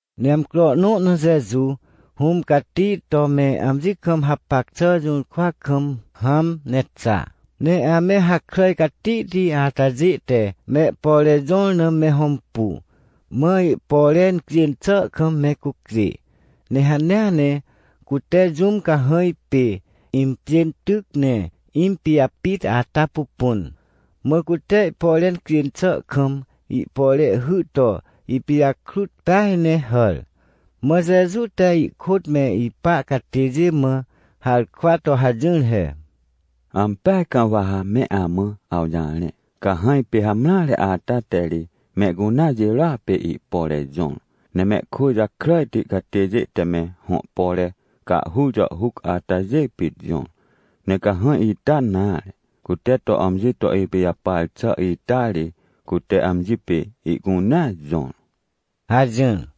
Ne amcro nõ na Jeju, Hũm Cati to me amji kam hapac xà jũrkwa kam hãm ne xa, ne ame hakràj catihti atajê te mehpore jõr na me hõmpu, mã ihpore incjên xà kam me cucjê. Ne hanea ne cute jũm cahãj pê impjên tyc ne impijapit ata pupun, mã cute ihpore incjên xà kam ihpore hy to ipijakrut peaj ne hàr. Mã Jeju te ihkôt me ipa catêjê mã harkwa to hajỹr he: ― Ampeaj kam wa ha me amã awjarẽ. Cahãj pê hamreare ata te ri mehcunea jirôa pê ihpore jõr. Ne mehkwỳ jakràjti catêjê te me hõ pore cahhur jàhhuc atajê pit jõr. Ne cahãj ita nare, cute to amji to ipijapar xà ita ri, cute amji pê ihcunea jõr ― hajỹr.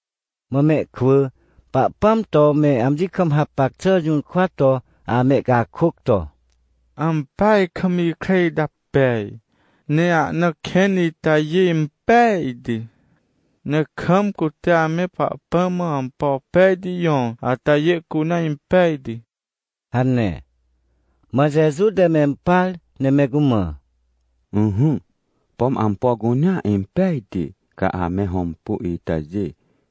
Mã mehkwỳ Pahpãm to me amji kam hapac xà jũrkwa to amehcakôc to: ― Ampeaj kam ikre ita pej! Ne ahna kẽn itajê impejti! Ne kam cute ame Pahpãm mã ampo pejti jõr atajê cunea impejti ― hane. Mã Jeju te mempar ne me cumã: ― Ỹhỹ, pom ampo cunea impejti ca ame hõmpu itajê,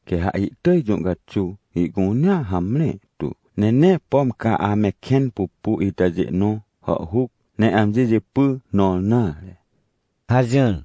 quê ha ihtỳj jũ caxuw ihcunea hamre tu, ne nee pom ca ame kẽn pupu itajê nõ hàhhuc, ne amji jipy nõr nare ― hajỹr.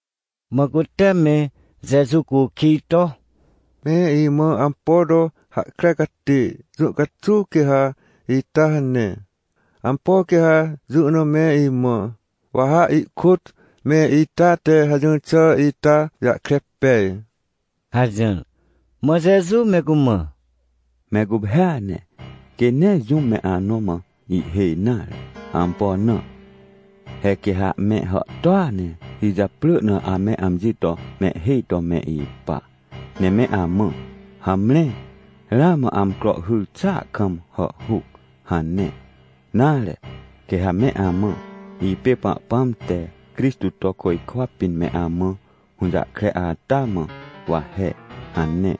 Mã cute me Jeju cukij to: ― Me imã ampo to hahkre catê, jũ caxuw quê ha ita hane? Ampo quê ha jũ na me imã, wa ha ihkôt me ita te hajỹr xà ita jahkre pej? ― hajỹr. Mã Jeju me cumã: ― Me guphêa ne, quê nee jũm me anõ mã ihhêj nare. Ampo na? He quê ha me hàhtôa ne ijaprỳ na ame amji to mehhêj to me ipa, ne me amã: “Hamre, ramã amcro hyr xàa kam hàhhuc” hane, nare, quê ha me amã: “Ipê Pahpãm te Crixtô to côjkwa pĩn me amã hũjahkre ata mã, wa he” hane.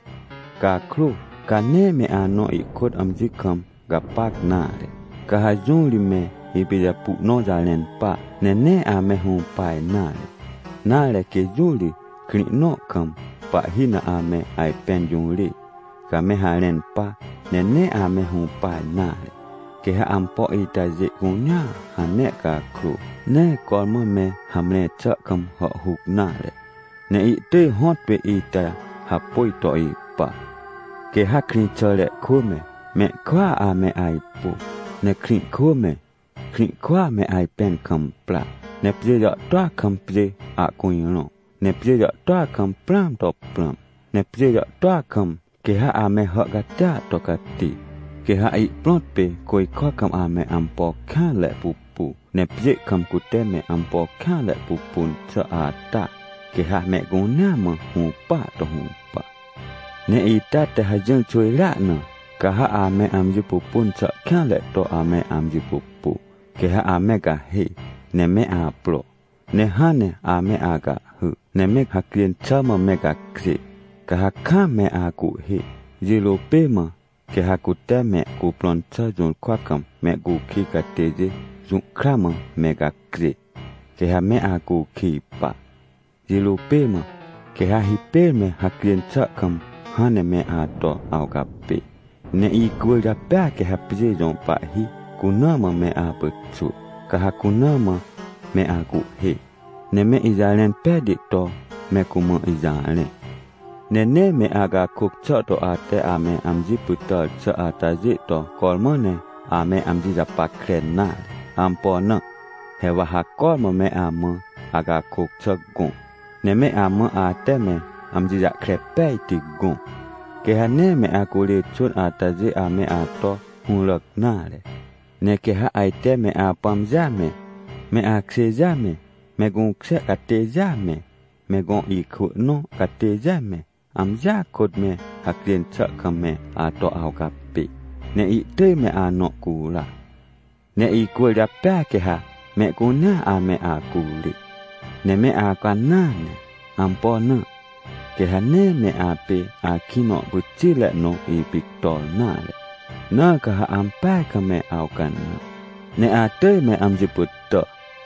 Cakrô, ca nee me anõ ihkôt amji kam gapac nare. Ca ha jũ ri me ipijapu nõ jarẽn pa, ne nee ame hũpa nare. Nare, quê jũ ri, krĩ nõ kam pahhi na ame ajpẽn jũrê, ca me harẽn pa, ne nee ame hũpa nare. Quê ha ampo itajê cunea hane cakrô, nee cormã me hamre xà kam hàhhuc nare, ne ihtỳj hõtpê ita hapôj to ipa. ― Quê ha krĩxàre kwỳ me, mehkwỳa ame ajpu, ne krĩ kwỳ me, krĩ kwỳa me ajpẽn kam pra. Ne pjê jàhtôa kam pjê ahcujrõ, ne pjê jàhtôa kam prãam to prãm, ne pjê jàhtôa kam quê ha ame hà catia to cati. Quê ha ihprõt pê côjkwa kam ame ampo kêanre pupu, ne pjê kam cute me ampo kêanre pupun xà ata, quê ha mehcunea mã hũpaa to hũpa. ― Ne ita te hajỹr xwỳjrea na, ca ha ame amji pupun xà kêanre to ame amji pupu. Quê ha ame gahê ne me apro, ne hãn ne ame acahhy, ne me hacjên xà mã me gacjê, ca ha kam me acuhhê. Jirô pê mã quê ha, cute me cuprõn xà jũrkwa kam mehcukij catêjê jũhkra mã me gacjê, quê ha me acukij pa, jirô pê mã quê ha hipêr me hacjên xà kam hãn ne me ato awcapê. Ne icwỳrjapêa quê ha pjê jõ pahhi cuna mã me apyxwỳ. Ca ha cuna mã me acuhhê, ne me ijarẽn pejti to me cumã ijarẽ. Ne nee me acakôc xà to ate ame amji pytàr xà atajê to cormã ne ame amji japackre nare. Ampo na? He wa ha cormã me amã acakôc xà gõ, ne me amã ate me amji jahkre pejti gõ, quê ha nee me acurê xwỳn atajê ame ato hũràc nare. ― Ne quê ha ajte me apãmjêa me, me akjêjêa me, me gũkjê catêjêa me, me gõ ikwỳ nõ catêjêa me, amjia kôt me hacjên xà kam me ato awcapê, ne ihtỳj me anõ cura. Ne icwỳrjapêa quê ha mehcunea ame acurê. Ne me awcanãa ne. Ampo na? Quê ha nee me apê akĩ nõ pyxitre nõ ipictor nare. Na ca ha ampeaj kam me awcanã, ne atỳj me amji pytà.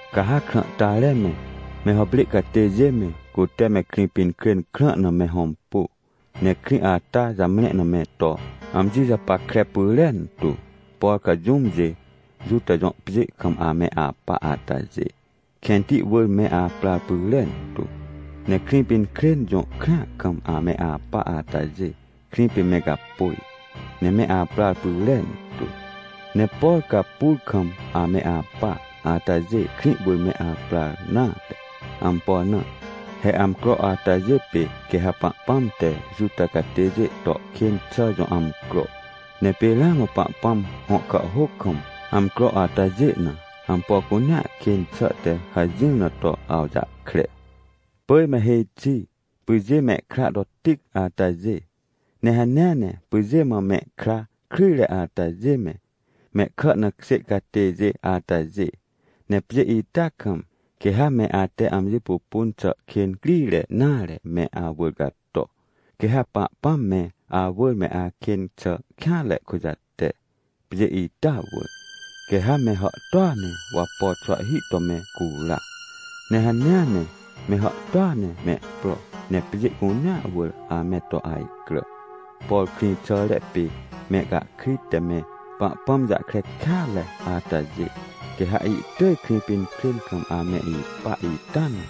― Ca ha krãhtare me, me hàprê catêjê me, cute me Krĩpinkrên krã na me hõmpu, ne krĩ ata jamre na me to amji japackre pyrentu. Por ca jũmjê Juta jõ pjê kam ame apa atajê, kẽnti wỳr me aprar pyrentu! Ne Krĩpinkrên jõ krĩa kam ame apa atajê, krĩ pê me gapôj, ne me aprar pyrentu! Ne por ca pur kam ame apa atajê krĩ wỳr me aprar nare! Ampo na? He amcro atajê pê quê ha Pahpãm te Juta catêjê to kên xà jõ amcro. Ne pê ramã Pahpãm hõ kàhhôc kam, amcro atajê na, ampo cunea kên xà te hajỹr na to awjahkre. ― Pỳj me hêj xi, pyjê mehkra to tic atajê, ne hanea ne pyjê mã me kra kryjre atajê me, mehkà na kjê catêjê atajê! Ne pjê ita kam, quê ha me ate amji pupun xà kên crire nare me awỳr cator. Quê ha Pahpãm me awỳr me akên xà kêanre kujate, pjê ita wỳr. Quê ha me hàhtôa ne wapo xwahhi to mehcura, ne hanea ne me hàhtôa ne mehpro ne pjê cunea wỳr ame to ajcrà. Por krĩxàre pê mehcahkrit te me Pahpãm jahkre kêatre atajê, quê ha ihtỳj Krĩpinkrên kam ame ipa ita na,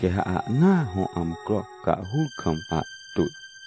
quê ha ahnaa hõ amcro cahhur kam ahtwỳ.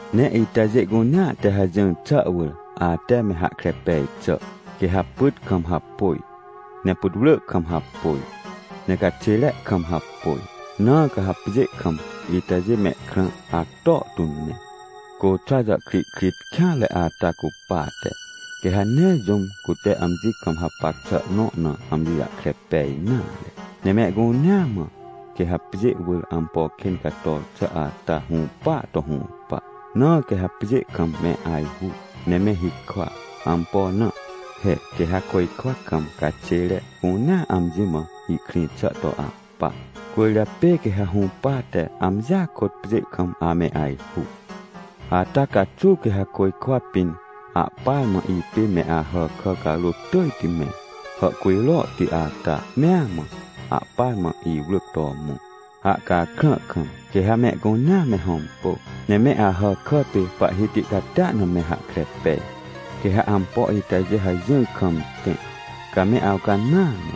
― Ne itajê cunea te hajỹr xà wỳr, ate me hahkre pej xà, quê ha pyt kam hapôj, ne putwrỳ kam hapôj, ne caxêre kam hapôj, na quê ha pjê kam itajê mehkrã acto tu ne. Côxwa jàhkrihkrit kêanre ata cupate, quê ha nee jũm cute amji kam hapac xà nõ na amji jahkre pej nare. Ne mehcunea mã, quê ha pjê wỳr ampo kên cator xà ata hũpaa to hũpa. Na quê ha pjê kam me ajhu ne me hikwa. Ampo na? He quê ha côjkwa kam caxêre cunea amji mã ihkrĩ xà to ahpa, cwỳrjapê quê ha hũpate amjia kôt pjê kam ame ajhu. ― Ata caxuw quê ha côjkwa pĩn ahpar mã ipê me Ahàkà carôt tỳjti me, hàhcujrohti ata mea mã, ahpar mã iwrỳc to mõ, ahcakrã kam. Quê ha mehcunea me hõmpu ne me Ahàkà pê Pahhiti catia na me hahkre pej. Quê ha ampo itajê hajỹr kam tẽ, ca me awcanãa ne,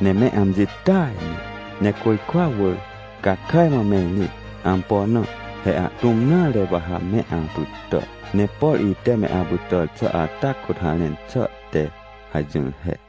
ne me amji tỳaj ne, ne côjkwa wỳr, ca kàj mã me rĩt. Ampo na? He ahtũm nare wa ha me apytà. Ne por ite me apytàr xà ata kôt harẽn xà te hajỹr he.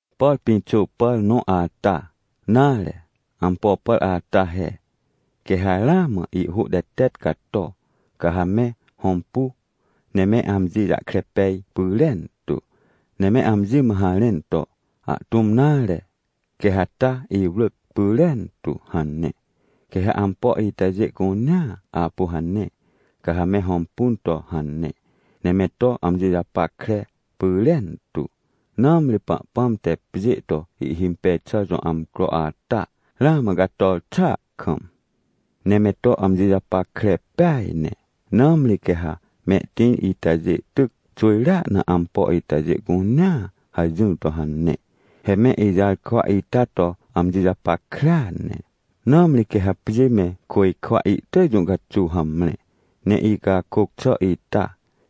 ― Por pĩxô pàr nõ ata, nare, ampo pàr ata he. Quê ha ramã ihhô tetet cato, ca ha me hõmpu, ne me amji jahkre pej pyrentu, ne me amji mã harẽn to: “Ahtũm nare, quê ha ta iwrỳc pyrentu” hane. Quê ha ampo itajê cunea apu hane, ca ha me hõmpun to hane, ne me to amji japackre pyrentu, nãmri Pahpãm te pjê to ihhimpej xà jõ amcro ata ramã cator xàa kam. ― Ne me to amji japackre peaj ne, nãmri quê ha mehtĩr itajê tyc xwỳjrea na ampo itajê cunea hajỹr to hane. He me ijarkwa ita to amji japackrea ne, nãmri quê ha pjê me côjkwa ihtỳj jũ caxuw hamre, ne icakôc xà ita,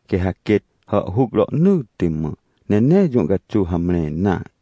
quê ha quêt hàhhuc rohnỳtti mã, ne nee jũ caxuw hamre nare.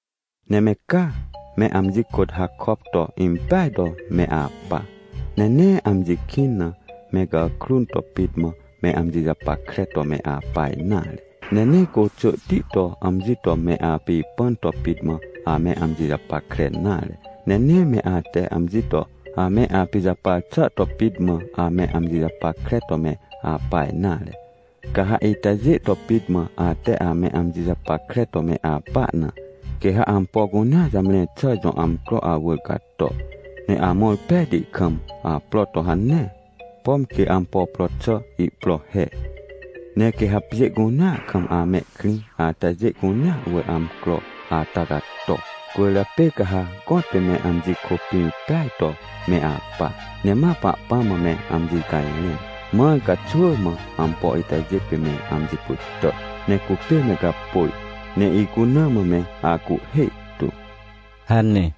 ― Ne me ca, me amji kôt hakop to impeaj to me apa. Ne nee amji kĩn na me gàkrun to pit mã me amji japackre to me apa nare. Ne nee côxỳhti to amji to me apipãn to pit mã ame amji japackre nare. Ne nee me ate amji to ame apijapar xà to pit mã ame amji japackre to me apa nare. Ca ha itajê to pit mã ate ame amji japackre to me apa na, quê ha ampo cunea jamre xà jõ amcro awỳr cato, ne amõr pejti kam apro to hane, pom quê ampo pro xà ihpro he. Ne quê ha pjê cunea kam amehkrĩ atajê cunea wỳr amcro ata cato. Cwỳrjapê ca ha gõtpê me amji kôpĩr peaj to me apa, ne ma Pahpãm mã me amji cajrẽn, mãr ca xwỳ mã ampo itajê pê me amji pytà, ne cupê me gapôj, ne icuna mã me acuhhê tu ― hane.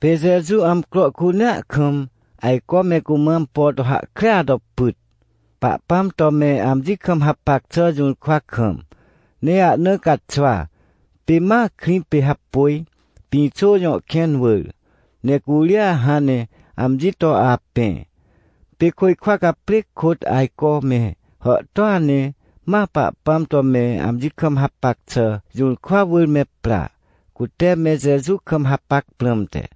Pê Jeju amcro cunea kam ajco me cumã ampo to hahkrea to pyt, Pahpãm to me amji kam hapac xà jũrkwa kam. Ne ahna caxwa, pê ma krĩ pê hapôj, Pĩxô jõ kẽn wỳr, ne curia hãn ne amji to apẽ. Pê côjkwa caprêc kôt ajco me hàhtôa ne ma Pahpãm to me amji kam hapac xà jũrkwa wỳr me pra, cute me Jeju kam hapac prãmte.